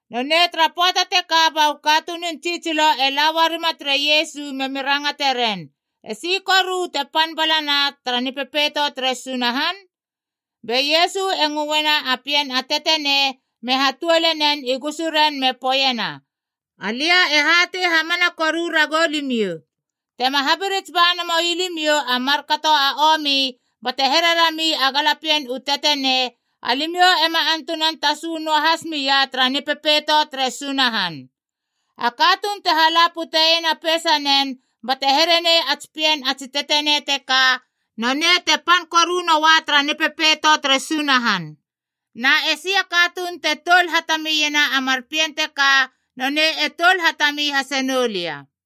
Nonei tara pöata teka ba u katunun tsitsilo e la uarima tere Iesu memi rangateren, “Esi koru te pan balana tara Nipepeito tere Sunahan?” Be Iesu e ngöena a pien a tetenei me hatuole nen i gusuren me poeiena, “Alia e hatei hamana koru ragou limiou. Tema habirits ba namoi limiou a markato a omi, bate here rami a galapien u tetenei, alimiou ema antunan tasu noahas mia tara Nipepeito tere Sunahan. A katuun te hala puteiena a peisanen bate here nei a tsi pien a tsi tetenei teka, nonei te pan koru noa tara Nipepeito tere Sunahan. Na e si a katuun te toul hatamiena a mar pien teka, nonei e toul hatami hase noulia.”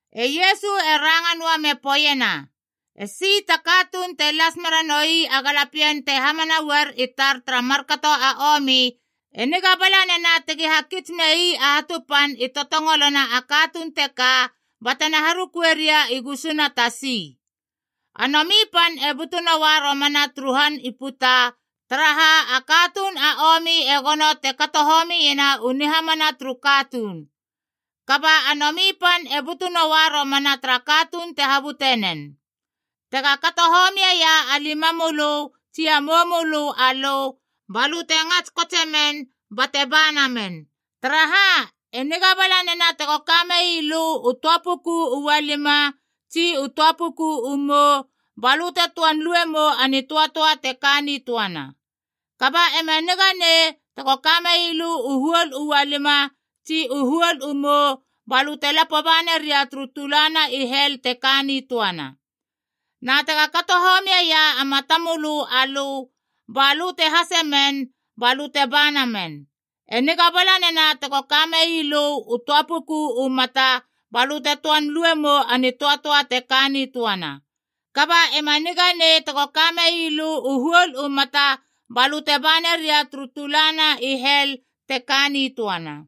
E Iesu e ranga noa me poeiena, “Esi ta katuun te las meranoi a galapien te hamana uar i tar tara markato a omi, e niga bala nena tegi hakits mei a hatu pan i totongolona a katuun teka batena harukue ria i gusuna tasi. A nomi pan e butu noa romana turu han i puta, taraha a katuun a omi e gono te kato homiena u nihamana turu katuun. Kaba a nomi pan e butu noa romana tara katuun te habute nen! Tega kato homieia a limamölö tsi a moumölö alö, balö te ngats kotsemen bate banamen! Taraha, e niga bala nena tego kamei lö u töa puku u ualima, tsi u töa puku u mou, balö te töan luemou a nitöatöa te ka nitöana. Kaba ema niganei tego kamei lö u huol u ualima tsi u huol u mou balö te lapo baneria turu tulana i hel te ka nitöana. Na tega kato homieia a matamölö alö, balö te hasemen balö te banamen. E niga bala nena tego kamei lö u töa puku u mata balö te töan luemou a nitöatöa te ka nitöana. Kaba ema niganei tego kamei lö u huol u mata balö te baneria turu tulana i hel te ka nitöana.”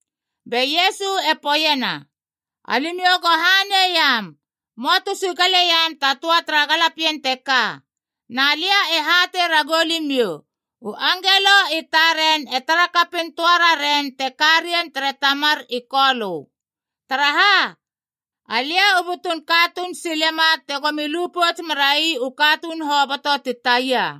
Be Iesu e poeiena, “Alimiou go haneiam möa tu sigaleiam ta töa tara galapien teka. Na lia e hatei ragou limiou, u angelo i taren e tarakapin töa raren te ka rien tere Tamar i Kolö. Taraha, Alia u butun katuun silema tegomi lu pouts merai u katuun hoboto ti taia.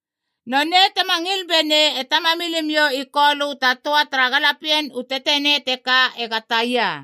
Nonei tema ngil benei e Tamamilimiou i Kolö ta töa tara galapien u tetenei teka ega taia.”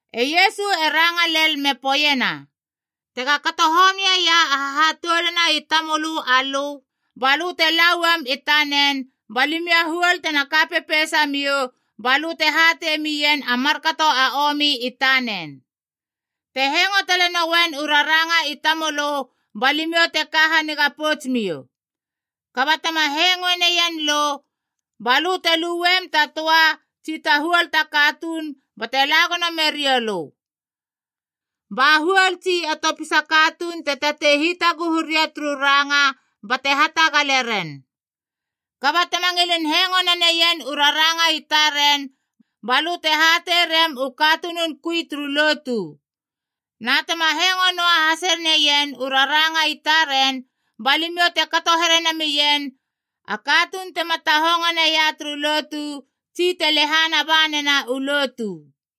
E Iesu e ranga lel me poeiena, “Tega kato homieia a hahatoulana i tamölö alö, balö te la uam i tanen ba limiou a huol te ka pepeisamiou balö te hatei mien a markato a omi i tanen. Te hengo talenoien u raranga i tamölö, ba limiou te ka haniga pouts miou. Kaba tema hengoe neien lö, balö te luem ta töa tsi ta huol ta katuun bate la gono meriou lö. Ba huol tsi a topisa katuun te tatei hitaguhu ria turu ranga bate hatagaleren. Kaba tema ngilin hengo naneien u raranga i taren, balö te hatei rem u katunun kui turu lotu. Na tema hengo noa hase neien u raranga i taren, ba limiou te kato here namien a katuun tema tahongo neia turu lotu, tsi te lehana banena u lotu.”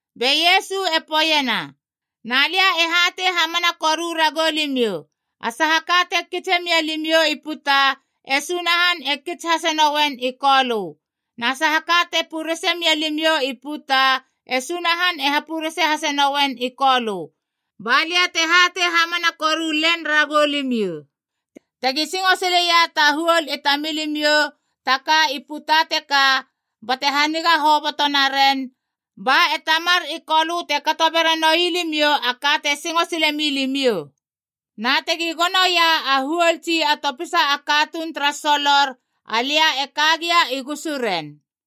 Be Iesu e poeiena, “Na lia e hatei hamana koru ragou limiou, a saha ka te kitse mialimiou i puta, e Sunahan e kits hasenouen i Kolö. Na saha ka te purese mialimiou i puta, e Sunahan e hapurese hase nouen i Kolö. Ba lia te hatei hamana koru len ragou limiou, tegi singo sileia ta huol i tamilimiou ta ka i puta teka, bate haniga hoboto naren, ba e Tamar i Kolö te kato beranoi limiou a ka te singo sile milimiou. Na tegi gonoia a huol tsi a topisa a katuun tara solor, alia e ka gia i gusuren.”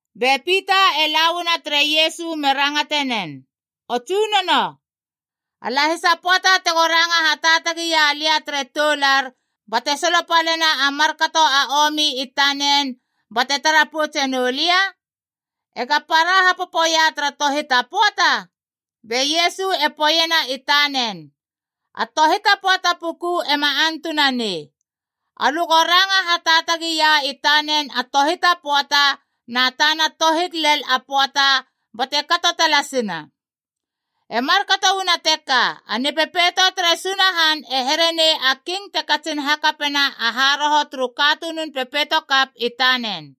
Be Pita e la uanama tere Iesu me rangatenen, “O Tsunono, a lahisa pöata tego ranga hataatagi ia lia tere toular bate solopalena a markato a omi i tanen, bate tara poutse noulia? Ega para hapopoia tara tohit a pöata?” Be Iesu e poeiena i tanen, “A tohit a pöata puku ema antunanei. Alö go ranga hataatagia i tanen a tohit a pöata, na tana tohit lel a pöata bate kato talasina. “E markato uana teka, a Nipepeito tere Sunahan e herenei a king te katsin hakapena a haroho turu katunun pepeitokap i tanen.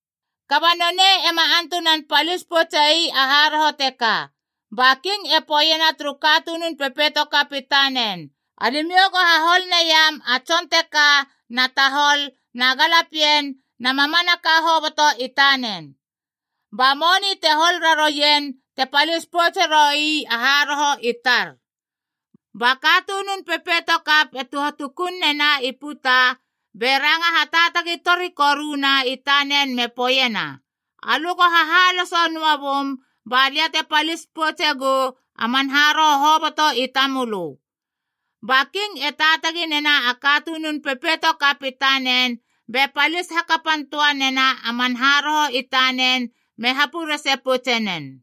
Kaba nonei ema antunan palis poutse ii a haroho teka. Ba king e poeiena turu katunun pepeitokap i tanen, ‘Alimiou go hahol neiam a tson teka na tahol, na galapien, na mamanaka hoboto i tanen. Ba moni te hol rarouien te palis poutse roi a haroho i tar.’ Ba katunun pepeitokap e tuhatukun nena i puta be ranga hataatagi tori koruna i tanen me poeiena, ‘Alö go hahaloso noa bum ba lia te palis poutse gou a man haroho hoboto i tamölö.’ Ba king e taatagi nena a katunun pepeito kap i tanen be palis hakapan töa nena a man haroho i tanen me hapurese poutsenen.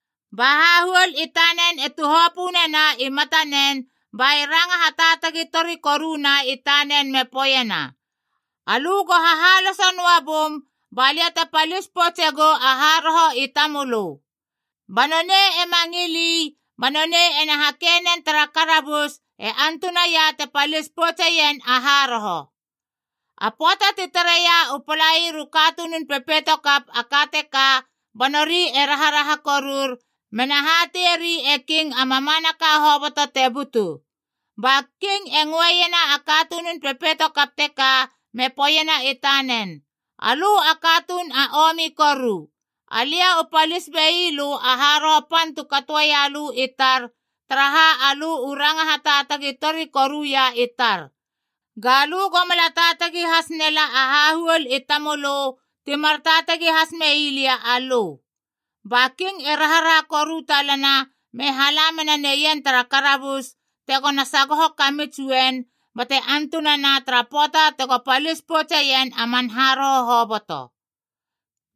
Ba hahuol i tanen e tuhopö nena i matanen ba e ranga hataatagi tori koruna i tanen me poeiena, ‘Alö go hahaloso noa bum balia te palis poutse gou a haroho i tamölö.’ Kaba nonei ema ngil ii ba nonei ena hakei nen tara karabus e antunaia te palis poutseien a haroho. “A pöata ti tareia u palair u katunun pepeitokap a ka teka ba nori e raharaha korur mena hateieri e king a mamanaka hoboto te butu. Ba king e ngöeiena a katunun pepeitokap teka me poeiena i tanen, ‘Alö a katuun a omi koru! Alia u palis bei lö a haroho pan tu katoia lö i tar, taraha alö u ranga hataatagi tori koruia i tar. Ga lö go mala taatagi hasnela a hahuol i tamölö ti mar taatagi has mei lia alö!’ Ba king e raharaha koru talana me hala mena neien tara karabus, tegona sagoho kamits uen bate antunana tara pöata tego palis poutseien man haroho hoboto.”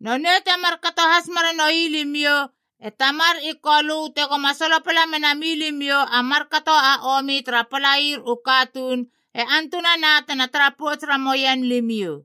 “Nonei te markato has meranoi limiou, e Tamar i Kolö tegoma solopala mena milimiou a markato a omi tara palair u katuun, e antunana tena tara pouts ramouen limiou.”